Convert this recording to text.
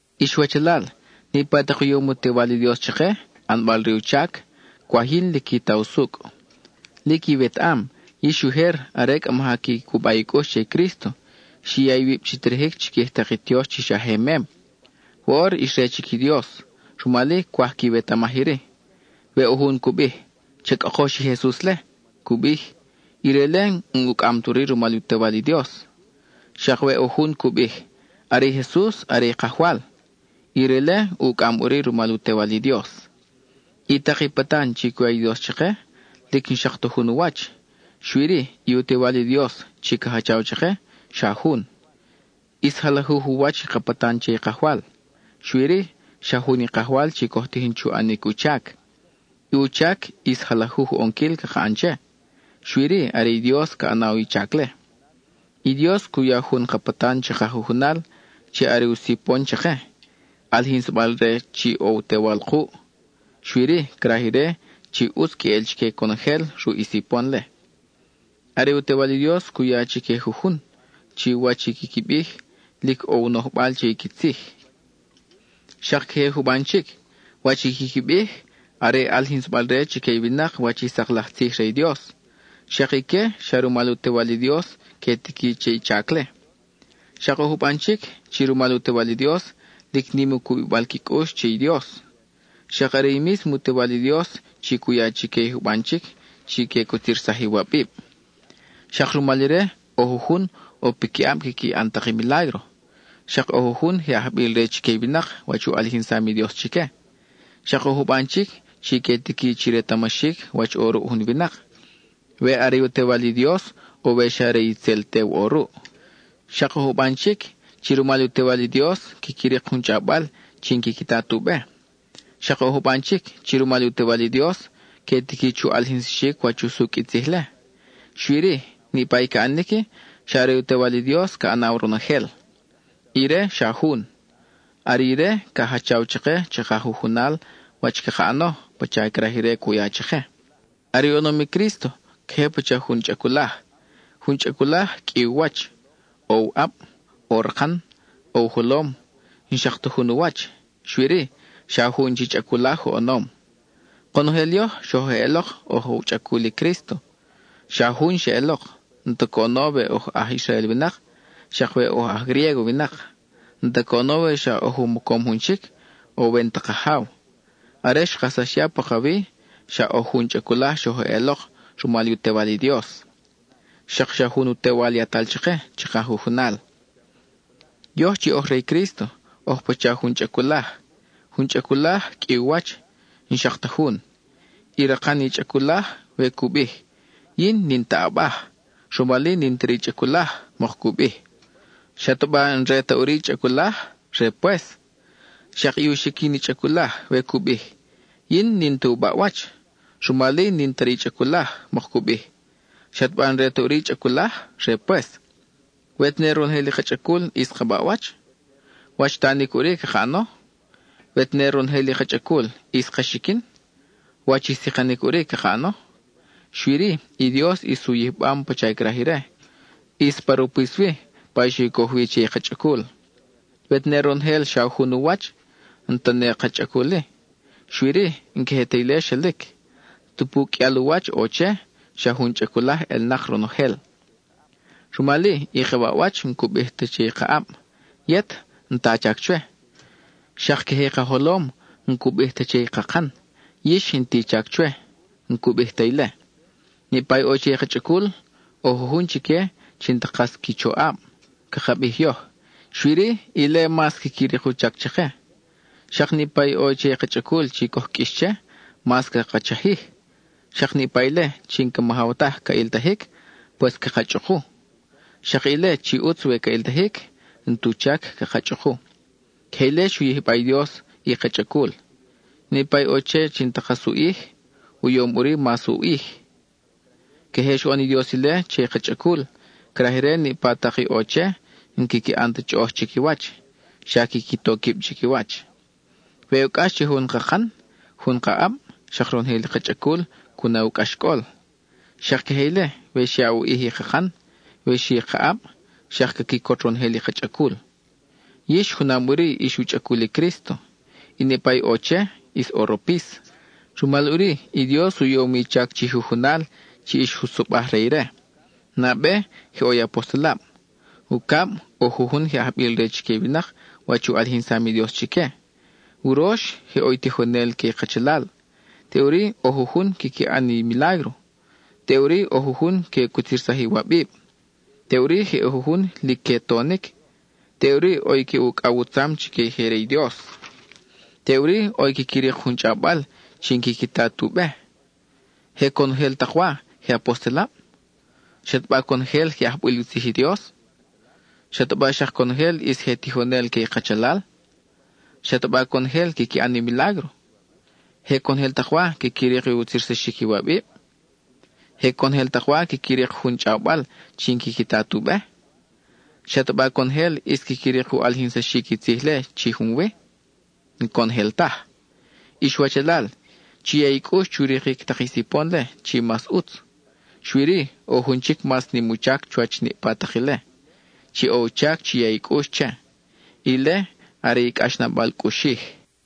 Ix wachalal, niʼpa tak i u yom u Tewal i Dios chake, ʼanbal re u chac, cwaj yin lic qui ta usucʼ, Lic iwetaʼam, yix ujer are cʼa maja qui cuba i cʼux che i Crísto, xi ya iwib chi terejic chiquij tak i tiox chi xa je mem. Woʼor ix re chic i Dios, rumal-i cwaj quiwetamaj iri: we ʼo jun cu bij, “¡Cha cʼokox i Jesus-le!” cu bij, ire-le n-ucʼam ta ʼuri rumal u Tewal i Dios. Xak we ʼo jun cu bij, “Are i Jesus are i Kajwal,” ire-le ucʼam ʼuri rumal u Tewal i Dios. I tak i patan chi cu ya i Dios chake, lic n-xak ta jun u wach, xui-ri, i u Tewal i Dios chi ca jachaw chake, xa jun. ʼIs jalajuj u wach i ka patan che i Kajwal, xui-ri, xa jun i Kajwal chi coj tijin chu ʼanic u chac. I u chac, ʼis jalajuj u ʼonquil caka ʼan che; xui-ri are i Dios ca ʼanaw i chac-le. I Dios cu ya jun ka patan chaka jujunal, chi are u sipon chake, ʼalijinsabal-re chi ʼo u Tewal kuʼ, xui-ri, craj ire chi ʼutz queʼel chique conojel ruʼ i sipon-le. Are i u Tewal i Dios cu ya chique jujun, chi wach i quiqui bij, lic ʼo u nojbal che i qui tzij; xak queje juban chic, wach i quiqui bij, are ʼalijinsabal-re chique i winak wach i sak laj tzij re i Dios; xak ique, xa rumal u Tewal i Dios que tiqui che i chac-le. Xak ʼo juban chic, chi rumal u Tewal i Dios, lic nim i u cubibal qui cʼux che i Dios. Xak are i mísmo u Tewal i Dios chi cu ya chique i juban chic chi que cutzirsaj iwabib. Xak rumal ire ʼo jujun ʼo piquiʼab quiqui ʼan tak i milágro; xak ʼo jujun je ajbil re chique i winak wach u ʼalijinsam i Dios chique. Xak ʼo juban chic chi que tiqui chi retamaxic wach ʼo ruʼ jun winak, we are u Tewal i Dios, o we xa are itzel tew ʼo ruʼ. Xak ʼo juban chic, chi rumal u Tewal i Dios, quiqui rik jun chʼawbal chi n-quiqui ta tu be. Xak ʼo juban chic, chi rumal u Tewal i Dios, que tiqui chu ʼalijinsaxic wach usucʼ i tzij-le. Xui-ri, niʼpa i ca ʼanic-i, xa are u Tewal i Dios ca ʼanaw ronojel. Ire, xa jun; are ire ca jachaw chake chaka jujunal wach caka ʼano, pacha craj ire cu ya chake. Are oʼonom i Crísto, queje pacha jun chʼaculaj. Jun chʼaculaj, qʼui u wach; ʼo u ʼab, ʼo rakan, ʼo u jolom, n-xak ta jun u wach; xui-ri, xa jun chi chʼaculaj oʼonom. Konojel yoj, xoj eʼelok oj u chʼacul i Crísto, xa jun xeʼelok. N-ta coʼono we oj aj Israel winak, xak we oj aj Griégo winak; n-ta coʼono we xa oj u mocom jun chic, ʼo we n-ta kajaw. Are xkajsax ya pakawi, xa oj jun chʼaculaj xoj eʼelok rumal u Tewal i Dios; xak xa jun u Tewal yatal chake chaka jujunal. Yoj chi oj re i Crísto oj pacha jun chʼaculaj. Jun chʼaculaj, qʼui u wach, n-xak ta jun. I rakan i chʼaculaj, we cu bij: “Yin n-in ta ʼabaj, rumal-i n-in ta re i chʼaculaj,” mok cu bij, ¿xataba n-re ta ʼuri i chʼaculaj? Re pues. Xak i u xiquin i chʼaculaj, we cu bij: “Yin n-in ta u baʼwach, rumal-i n-in ta re i chʼaculaj,” mok cu bij, ¿xataba n-re ta ʼuri i chʼaculaj? Re pues. We tene ronojel i ka chʼacul ʼis ka baʼwach, ¿wach i tanic ʼuri caka ʼano? We tene ronojel i ka chʼacul ʼis ka xiquin, ¿wach i sikanic ʼuri caka ʼano? Xui-ri, i Dios ʼis u yijbam pacha craj ire; ʼis pa ropis-wi, pa xe u coj wi che i ka chʼacul. We tene ronojel xa jun u wach, n-ta ne ka chʼacul-i. Xui-ri, n-queje ti ile xelic; tupu qʼuial u wach ʼo che, xa jun chʼaculaj ʼelnak ronojel. Rumal-i, i ka baʼwach n-cu bij ta che i ka ʼab: “Yet, n-ta a chac chwe.” Xak queje i ka jolom, n-cu bij ta che i kakan: “Yix, n-ti i chac chwe.” N-cu bij ta ile. Niʼpa i ʼo che i ka chʼacul, ʼo jujun chique chi n-ta kas qui choʼab, caka bij yoj; xui-ri, ile mas quiqui rik u chac chake. Xak niʼpa i ʼo che i ka chʼacul chi coj qʼuix che, mas caka chajij; xak niʼpa ile chi n-ca majaw taj ca ʼiltajic, pues caka chʼuku. Xak ile chi ʼutz we ca ʼiltajic, n-tu chac caka chʼuku. Queje ile xu yijba i Dios i ka chʼacul; niʼpa i ʼo che chi n-ta kas u ʼij, u yom ʼuri mas u ʼij. Queje xoʼon i Dios ile che i ka chʼacul; craj ire niʼpa tak i ʼo che n-quiqui ʼan ta chʼoʼoj chiquiwach, xa quiqui to quib chiquiwach. We ʼo cʼax che jun kakan jun ka ʼab, xak ronojel i ka chʼacul cu na u cʼaxcʼol. Xak queje ile, we xyaʼ u ʼij i kakan, we xi ka ʼab, xak ca quicot ronojel i ka chʼacul. Yix junam ʼuri ix u chʼacul i Crísto, y niʼpa i ʼo che, ʼis ʼo ropis. Rumal ʼuri i Dios u yom i chac chi jujunal chi ix jutzobaj re ire: nabe, je ʼo i apostelab; ucab, ʼo jujun je ajbil re chique i winak wach u ʼalijinsam i Dios chique; urox, je ʼo i tijonel que i kachalal; teʼuri ʼo jujun quiqui ʼan i milágro; teʼuri ʼo jujun que cutzirsaj iwabib; teʼuri je ʼo jujun lic que tonic; teʼuri ʼo i que ucʼaw u tzam chique i je re i Dios, teʼuri ʼo i quiqui rik jun chʼawbal chi n-quiqui ta tu be. ¿Je conojel tak wa, je apostelab? ¿Xataba conojel je ajbil u tzij i Dios? ¿Xataba xak conojel ʼis je tijonel que i kachalal? ¿Xataba conojel quiqui ʼan i milágro? ¿Je conojel tak wa quiqui rik utzirsaxic iwabib? ¿Je conojel tak wa quiqui rik jun chʼawbal chi n-quiqui ta tu be? ¿Xataba conojel ʼis quiqui rik u ʼalijinsaxic i tzij-le chi junwi? N-conojel taj. Ix wachalal, chi ya i cʼux chu rikic tak i sipon-le chi mas ʼutz; xui-ri, ʼo jun chic mas nim u chac chuwach niʼpa tak ile, chi ʼo u chac chi ya i cʼux che; ile are i cʼaxnabal cʼuxij.